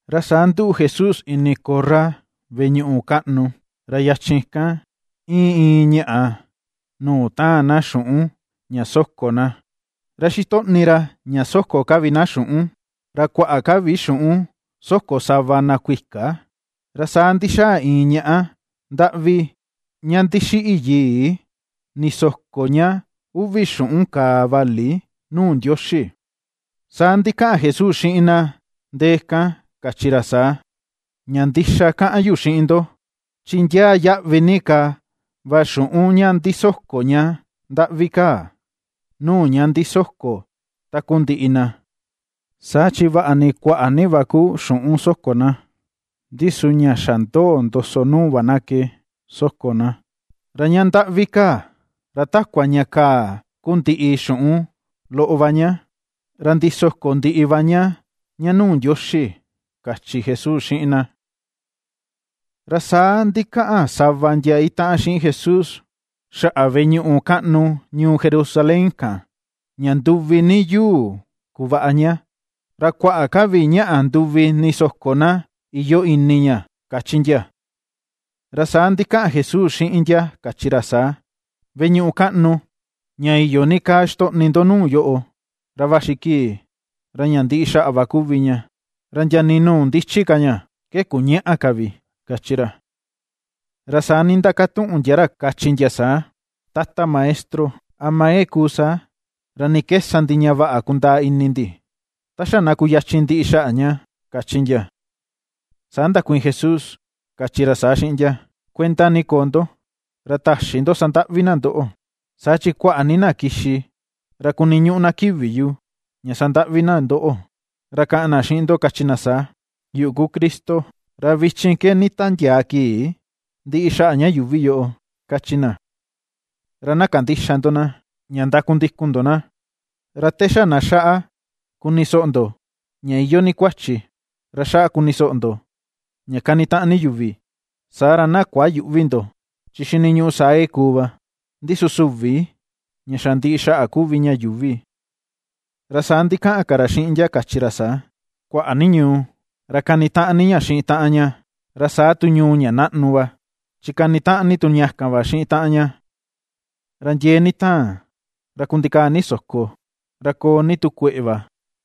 Ra saa nduꞌu Jesús ini korra veꞌe ñuꞌu kaꞌnu, ra yachin kan, íin iin ñáꞌa nuu taan na xuꞌun ña soko na. Ra xitoꞌni ra ña soko ka vi na xuꞌun, ra kuaꞌa ka vi xuꞌun soko sava na kuika. Ra saa ndixaa iin ñaꞌá ndaꞌvi ña ndixiꞌi yii, ndisoko ña uvi xuꞌun kàà vali nuu Ndioxi. Saa ndikaꞌan Jesús xiꞌin na ndee kan, kachi ra saa: ―Ña ndixa kaꞌan yu xiꞌin ndo, chi ndiaa yaꞌvi ni ka va xuꞌun ña ndisoko ña ndaꞌvi kaa nuu ña ndisoko takundiꞌi na. Saa chi vaꞌa ni kuaꞌa ni va ku xuꞌun soko na, ndi su ña xa ndoo ndoso nuu va na ke soko na. Ra ña ndaꞌvi kaa, ra takua ña kaa ku ndiꞌi xuꞌun loꞌo va ña, ra ndisoko ndiꞌi va ña ña nuu Ndioxi ―kachi Jesús xiꞌin na. Ra saa ndikaꞌan sava ndia itaꞌan xiꞌin Jesús, xaꞌa veꞌe ñuꞌu kaꞌnu ñuu Jerusalén kan ña nduvi ni yuu kuvaꞌa ña, ra kuaꞌa ka vi ñaꞌa nduvi ndisoko na iyoo ini ña, kachi ndia. Ra saa ndikaꞌan Jesús xiꞌin ndia kachi ra saa: ―Veꞌe ñuꞌu kaꞌnu ña iyo ni kaa xitoꞌni ndo nuu yoꞌo, ra vaxi kii ra ña ndiꞌi xaꞌa va kuvi ña, ra ndia nii nuu ndichi ka ña ke kuñaꞌa ka vi ―kachi ra. Ra saa nindakatuꞌun ndia ra kachi ndia saa: ―Tata Maestro, ¿ama ke kuu saa? ¿Ra ni ke sa ndi ña vaꞌa kundaa ini ndi ta xa na kuyachin ndiꞌi xaꞌa ña? ―kachi ndia. Saa ndakuiin Jesús, kachi ra saa xiꞌin ndia: ―Kuenda ni koo ndo ra täxi ndo sandaꞌvi na ndoꞌo. Saa chi kuaꞌa ni na kixi ra kuniñuꞌu na kivi yu ña sandaꞌvi na ndoꞌo, ra kaꞌan na xiꞌin ndo, kachi na saa: “Yuꞌu ku Cristo; ra vichin ke nditandiaa kii ndiꞌi xaꞌa ña yuuvi yoꞌo”, kachi na. Ra na kandïxa ndo na, ña ndakundikun ndo na. Ra te xa na xaꞌa kuni soꞌo ndo ña iyoo ni kuachi, ra xaꞌa kuni soꞌo ndo ña kanitaꞌan ni yuvi, saa ra na kuayüꞌvi ndo, chi xiniñuꞌu saa ke kuu va. Ndi su süvi ña xa ndiꞌi xaꞌa kuvi ña yuuvi. Ra saa ndikaꞌan ka ra xiꞌin ndia, kachi ra saa: ―Kuaꞌa ni ñuu ra kanitaꞌan ni ña xiꞌin taꞌan ña, ra saa tu ñuu ña naꞌnu va, chi kanitaꞌan ni tu ña kan va xiꞌin taꞌan ña. Ra ndiee ni taan, ra kundikaa ni soko, ra koo ni tu kueꞌe va,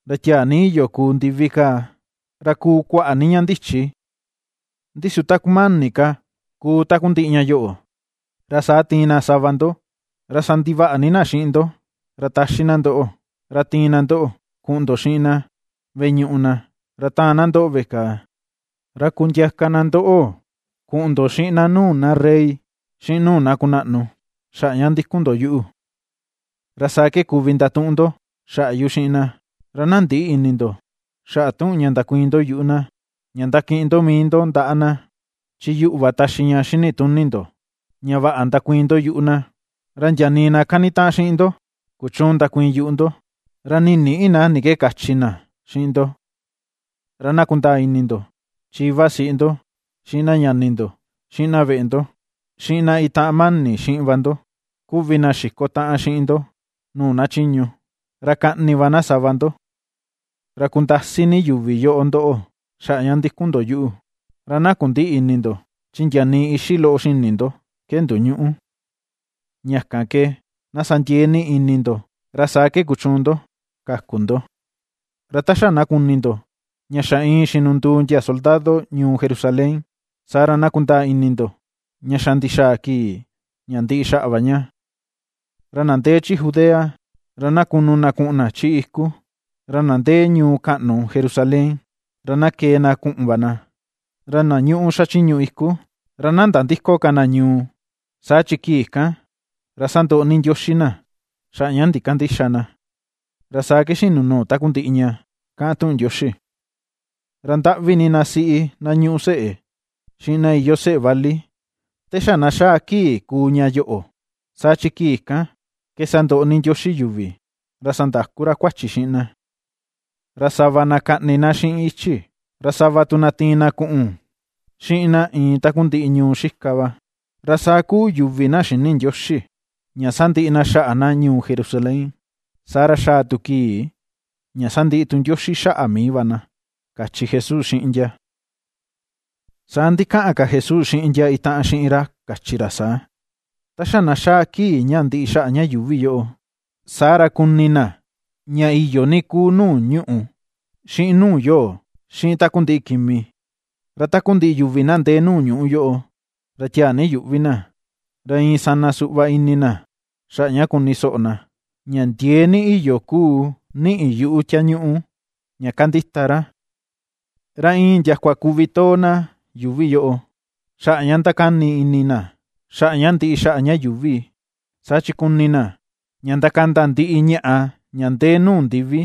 ra tiaa ni iyo kuu ndivi kaa, ra kuu kuaꞌa ni ña ndichi. ’Ndi su ta kumani ka kuu takundiꞌi ña yoꞌo, ra saa tiin na sava ndo ra sandivaꞌa ni na xiꞌin ndo, ra taxi na ndoꞌo, ra tiin na ndoꞌo kuꞌun ndo xiꞌin na veꞌe ñuꞌu na, ra taan na ndoꞌo veꞌe kàà, ra kundiaka na ndoꞌo kuꞌun ndo xiꞌin na nuu na rey, xiꞌin nuu na kunaꞌnu xaꞌa ña ndikun ndo yuꞌu. Ra saa ke kuvi ndatuꞌun ndo xaꞌa yu xiꞌin na. Ra na ndïꞌi ini ndo xaꞌa tuꞌun ña ndakuiin ndo yuꞌu na, ña ndakiꞌin ndo mii ndo ndaꞌa na. Chi yuꞌu va taxi ña xini tuni ndo, ña vaꞌa ndakuiin ndo yuꞌu na, ra ndia nii na kanitaꞌan xiꞌin ndo kuchüun ndakuiin yuꞌu ndo, ra nii nïꞌi na ni ke kachi na xiꞌin ndo. Ra na kundaa ini ndo, chi ivasiꞌi ndo, xiꞌin na ñani ndo, xiꞌin na veꞌe ndo, xiꞌin na itaꞌan mani xiꞌin va ndo kuvi na xiko taꞌan xiꞌin ndo nuu na chiñu. Ra kaꞌni va na sava ndo. Ra kundasi ni yuvi yoꞌo ndoꞌo xaꞌa ña ndikun ndo yuꞌu, ra na kundïꞌi ini ndo, chi ndia nii ixi loꞌo xini ndo ke ndoñüꞌu. Ña kan ke na sa ndiee ni ini ndo, ra saa ke kuchuun ndo kaku ndo. ’Ra ta xa na kuni ndo, ña xa iin xinunduu ndia soldado ñuu Jerusalén, saa ra na kundaa ini ndo ña xa ndixaa kii ña ndiꞌi xaꞌa va ña. Ra na ndee chi Judea, ra na kunu na kuꞌun na chi iku, ra na ndee ñuu kaꞌnu Jerusalén, ra na kee na kuꞌun va na, ra na ñuꞌu xachiñu iku, ra na nandïko ka na ñuu. Saa chi kii kan ra sandoꞌo ni Ndioxi na xaꞌa ña ndikandïxa na, ra saa ke xinu nuu takundiꞌi ña kaꞌan tuꞌun Ndioxi. ¡Ra ndaꞌvi ni na siꞌi na ñuꞌu seꞌe, xiꞌin na iyoo seꞌe vali te xa na xaa kii ña kuu ña yoꞌo! Saa chi kii kan ke sandoꞌo ni Ndioxi yuvi, ra sandaku ra kuachi xiꞌin na. Ra sava na kaꞌni na xiꞌin ichi, ra sava tu na tiin na kuꞌun xiꞌin na iin takundiꞌi ñuu xika va, ra saa kuu yuvi na xïni Ndioxi ña sandiꞌi na xaꞌa na ñuu Jerusalén, saa ra xaa tu kii ña sandiꞌi Ndioxi xaꞌa mii va na ―kachi Jesús xiꞌin ndia. Saa ndikaꞌan ka Jesús xiꞌin ndia itaꞌan xiꞌin ra, kachi ra saa: ―Ta xa na xaa kii ña ndiꞌi xaꞌa ña yuuvi yoꞌo, saa ra kuni na ña iyo ni kuu nuu ñuꞌù xiꞌin nuu yoo, xiꞌin takundiꞌi kimi; ra takundiꞌi yuvi na ndee nuu ñuꞌu yoꞌo, ra tiaa ni yuꞌvi na, ra iin sana suꞌva ini na xaꞌa ña kuni soꞌo na, ña ndiee ni iyoo kuu niꞌi yuꞌu tiañuꞌu ña kandita ra. Ra iin ndiakua kuvi too na yuuvi yoꞌo, xaꞌa ña ndakani ini na xaꞌa ña ndiꞌi xaꞌa ña yuuvi, saa chi kuni na ña ndakanda ndiꞌi ñaꞌa ña ndee nuu ndivi.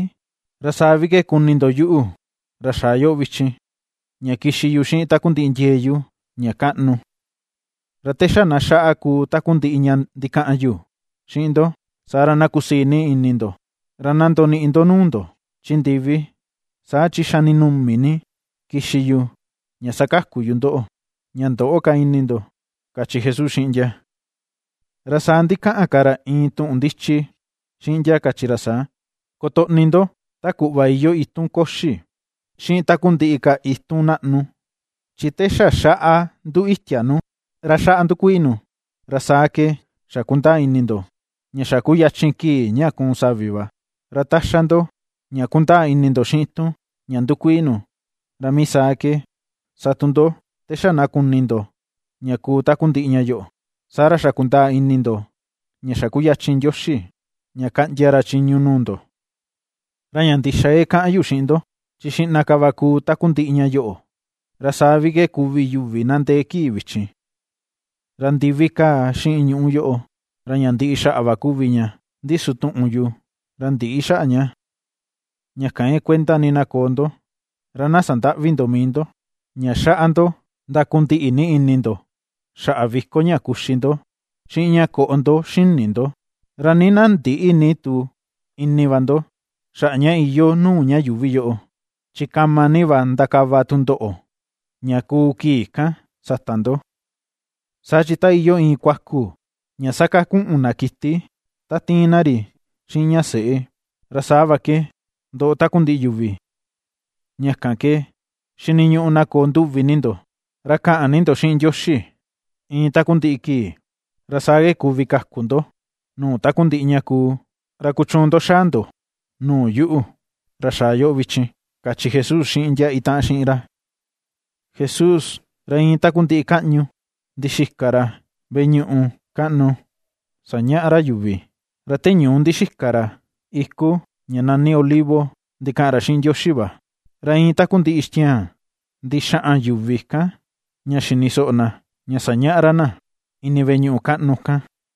Ra saa vi ke kuni ndo yuꞌu, ra xaa yoꞌo vichin, ña kixi yu xiꞌin takundiꞌi ndiee yu ña kaꞌnu. Ra te xa na xaꞌa kuu takundiꞌi ña ndikaꞌan yu xiꞌin ndo, saa ra na kusii ini ndo, ra na ndoniꞌi ndo nuu ndo chi ndivi. Saa chi xa ndinumi ni kixi yu ña sakaku yu ndoꞌo, ña ndöꞌo ka ini ndo ―kachi Jesús xiꞌin ndia. Ra saa ndikaꞌan ka ra iin tuꞌun ndichi xiꞌin ndia, kachi ra saa: ―Kotoꞌni ndo ta kuꞌva iyoo itun koxi xiꞌin takundiꞌi ka itun naꞌnu. Chi te xa xaꞌa nduu itia nu, ra xaꞌa ndukuii nu, ra saa ke xa kundaa ini ndo ña xa kuyachin kii ña kuun savi va. Ra ta xa ndo ña kundaa ini ndo xiꞌin itun ña ndukuii nu, ra mii saa ke sa tu ndo te xa na kuni ndo ña kuu takundiꞌi ña yoꞌo, saa ra xa kundaa ini ndo ña xa kuyachin Ndioxi ña kaꞌndia ra chiñu nuu ndo. ’Ra ña ndixa ke kaꞌan yu xiꞌin ndo, chi xiꞌna ka va kuu takundiꞌi ña yoꞌo, ra saa vi ke kuvi yuvi na ndee kii vichin. Ra ndivi kaa xiꞌin ñuꞌù yoꞌo, ra ña ndiꞌi xaꞌa va kuvi ña, ndi su tuꞌun yu ra ndïꞌi xaꞌa ña. ’Ña kan ke kuenda ni na koo ndo, ra na sandäꞌvi ndo mii ndo, ña xaꞌa ndo ndakundiꞌi ni ini ndo xaꞌa viko ña kuxi ndo, xiꞌin ña koꞌo ndo xini ndo, ra nii na ndïꞌi ni tu ini va ndo xaꞌa ña iyoo nuu ña yuuvi yoꞌo, chi kama ni va ndakava tundoꞌo ña kuu kii kan sata ndo. Saa chi ta iyoo iin kuakun ña sakakuꞌun na kiti ta tiin na ri xiꞌin ña seꞌe, ra saa va ke ndoꞌo takundiꞌi yuvi. Ña kan ke xiniñuꞌu na koo nduvi ni ndo, ra kaꞌan ni ndo xiꞌin Ndioxi iin takundiꞌi kii, ra saa ke kuvi kaku ndo nuu takundiꞌi ña kuu, ra kuchuun ndo xaa ndo nuu yuꞌu, ra xaa yoꞌo vichin ―kachi Jesús xiꞌin ndia itaꞌan xiꞌin ra. Jesús, ra iin takundiꞌi kaꞌñu ndixika ra veꞌe ñuꞌu kaꞌnu sañaꞌa ra yuvi, ra te ñuu ndixika ra iku ña nani olivo ndikaꞌan ra xiꞌin Ndioxi va. Ra iin takundiꞌi ixtiaan ndixaꞌan yuvi kan ña xini soꞌo na, ña sañaꞌa ra na ini veꞌe ñuꞌu kaꞌnu kan.